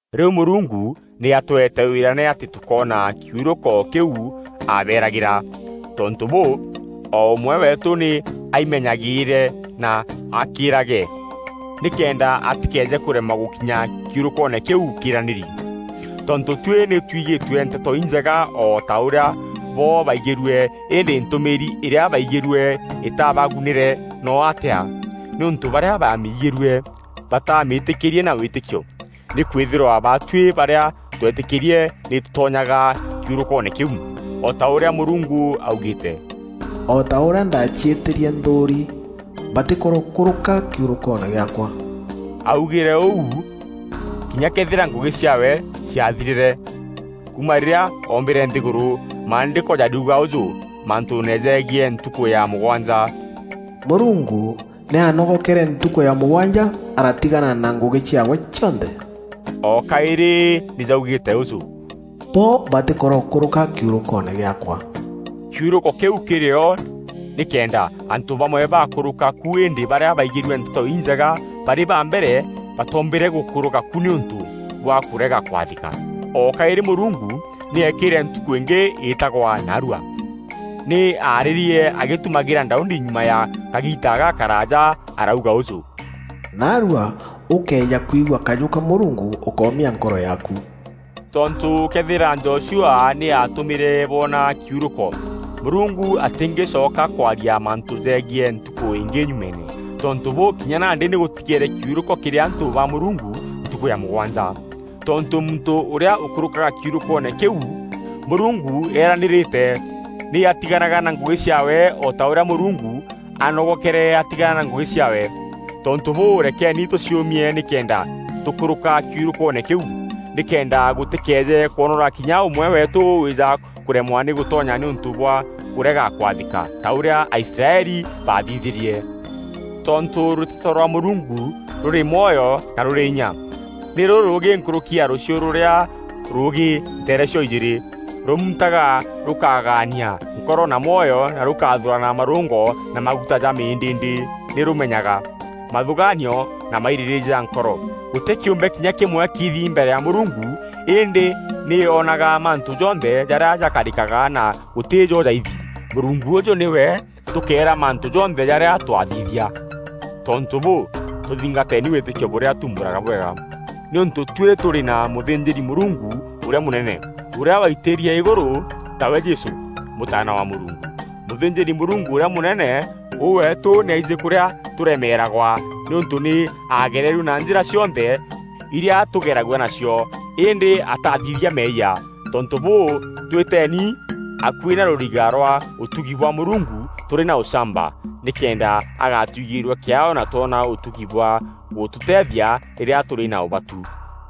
Rîu Mûrungu nî atweete wîrane atî tûkoona kiurûko kîu aabeeragîra. Tontû bûû, o ûmwe weetû nî aimenyagîîre na akîrage, nîkenda atîkeeje kûremwa gûkinya kiurûkoone kîu kîîranîri. Tontû tuî nî twigîtue Nteto Injega o ta ûrîa bo baigîrue. Îndî ntûmîîri îrîa baaigîrue îtaabagunîre noo atîa, nîûntû barîa baamigîrue bataamîtîkîrîrie na wîtîkio. Nîkwîthîrwa baatuî barîa tweetîkîrie nî tûtonyaga kiurûkoone kîu, o ta ûrîa Mûrungu augîîte, “O ta ûrîa ndaaciîtîrie nthûûri, ‘Batîkorokûrûka kiurûkoone gîaakwa.’” Aaugîre ûu kinya këethîra ngûgî ciaawe ciathirîre kuuma rîrîa oombîre nthîgûrû. Maandîko jariuga ûjû mantûûne jegiî ntukû ya mûgwanja, “Mûrungu nî aanogokere ntukû ya mûgwanja aratigana na ngûgî ciaawe cionthe.” O kaîrî nî jaugîîte ûjû, “Bo batîkorokûrûka kiurûkoone gîaakwa.” Kiurûko kîu kîrî o nîkenda antû bamwe bakûrûka ku îndî barîa baaigîrue Nteto Injega barî ba mbere batoombîre gûkûrûka ku nîûntû bwa kûrega kwathîka. O kaîrî Mûrungu nî eekîre ntukû îngî îtagwa “Naarua.” Nî aarîrie agîtumagîra Daudi nyuma ya kagiita gakaraaja arauga ûjû, “Naarua, ûkëeja kwigua kajû ka Mûrungu, ûkómia nkoro yaaku.” Tontû këethîra Joshua nî aatûmîre boona kiurûko, Mûrungu atîngîcoka kwaria mantû jegiî ntukû îngî nyumeene. Tontû bûû, kinya nandî nî gûtigeere kiurûko kîrî antû ba Mûrungu ntukû ya mûgwanja. Tontû muntû ûrîa ûkûrûkaga kiurûkoone kîu Mûrungu eranîîrîte, nî atiganaga na ngûgî ciaawe o ta ûrîa Mûrungu aanogokere atigana na ngûgî ciaawe. Tontû bûû, rekeeni tûciûmie nîkenda tûkûrûka kiurûkoone kîu, nîkenda gûtîkeeje kwonora kinya ûmwe weetû wîîja kûremwa gûtonya nîûntû bwa kûrega kwathîka ta ûrîa Aisraeli baathithîrie. Tontû rûteto rwa Mûrungu rûrî mwoyo na rûrî inya, nî rûrûûgî nkûrûki ya rûchiu rûrîa rûûgî nteere cio-ijîîrî. Rûmuntaga rûkagaania nkoro na mwoyo na rûkaathûrana marûngo na maguta ja mîndîîndî. Nî rûmenyaga mathûgaanio na mairîrîîria ja nkoro. Gûtî kîûmbe kinya kîmwe kiithi mbere ya Mûrungu. Îndî nî onaga mantû jonthe jarîa jakarîkaga na gûtî jo jaithi. Mûrungu ûûjû nîwe tûkeera mantû jonthe jarîa twaathithia. Tontû bûû, tûthingateeni wîtîkio bûrîa tuumbûraga bwega, nîûntû tuî tûrî na mûthînjîri-Mûrungu ûrîa mûnene, ûrîa waitîrie îgûrû, tawe Jesû, Mûtaana wa Mûrungu. Mûthînjîri-Mûrungu ûrîa mûnene ûu weetû nî aijî kûrîa tûremeeragwa nîûntû nî aagererue na njîra cionthe irîa tûgeragua nacio, îndî ataathithia meeyia. Tontû bûû, twîteeeni akuî na rûriga rwa ûtugi bwa Mûrungu tûrî na ûchamba nîkenda agatuigîîrua kîaao na twona ûtugi bwa gûtûteethia rîrîa tûrî na ûbatu.